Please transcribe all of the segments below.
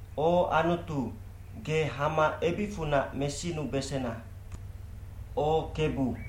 O Anutu, ge hama ebicfunac mesinubesena. O Kebu,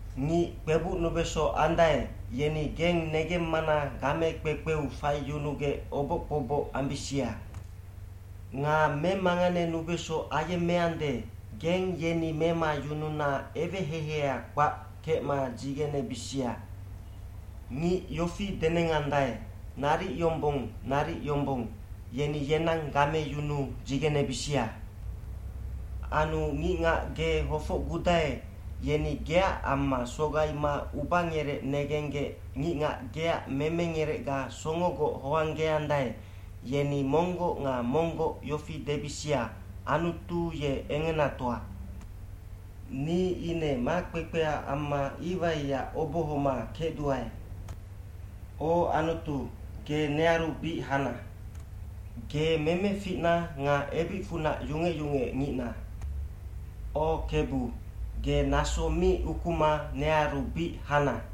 Ngic kpebucnubeso andae, yeni geng negemmana game kpekpeu faiyunugec oboc kpoboc ambisia. Nga memanganenubeso ayemmeande, geng yeni memayununa eweheiheia kpac kecma dzigenebisia. Ngic yofi denengandae, “Naric yombong, naric yombong.” yeni yenang gameyunuu dzigenebisia. Anu ngicngac ge hofocgudae, yeni geac amma sogaima ubangerec negenggec ngicngac geac memengerecga songogoc hoanggeandae, yeni monggoc nga monggoc yofi debisia, “Anutu ye engenatoa.” Ni ine makpekpea amma iwaiac obohoma kecduae. O Anutu, ge nearu bic hana. Ge memeficna nga ebicfunac yungec yungecngicna. O Kebu, ge naso mi ukuma nearu bic hana.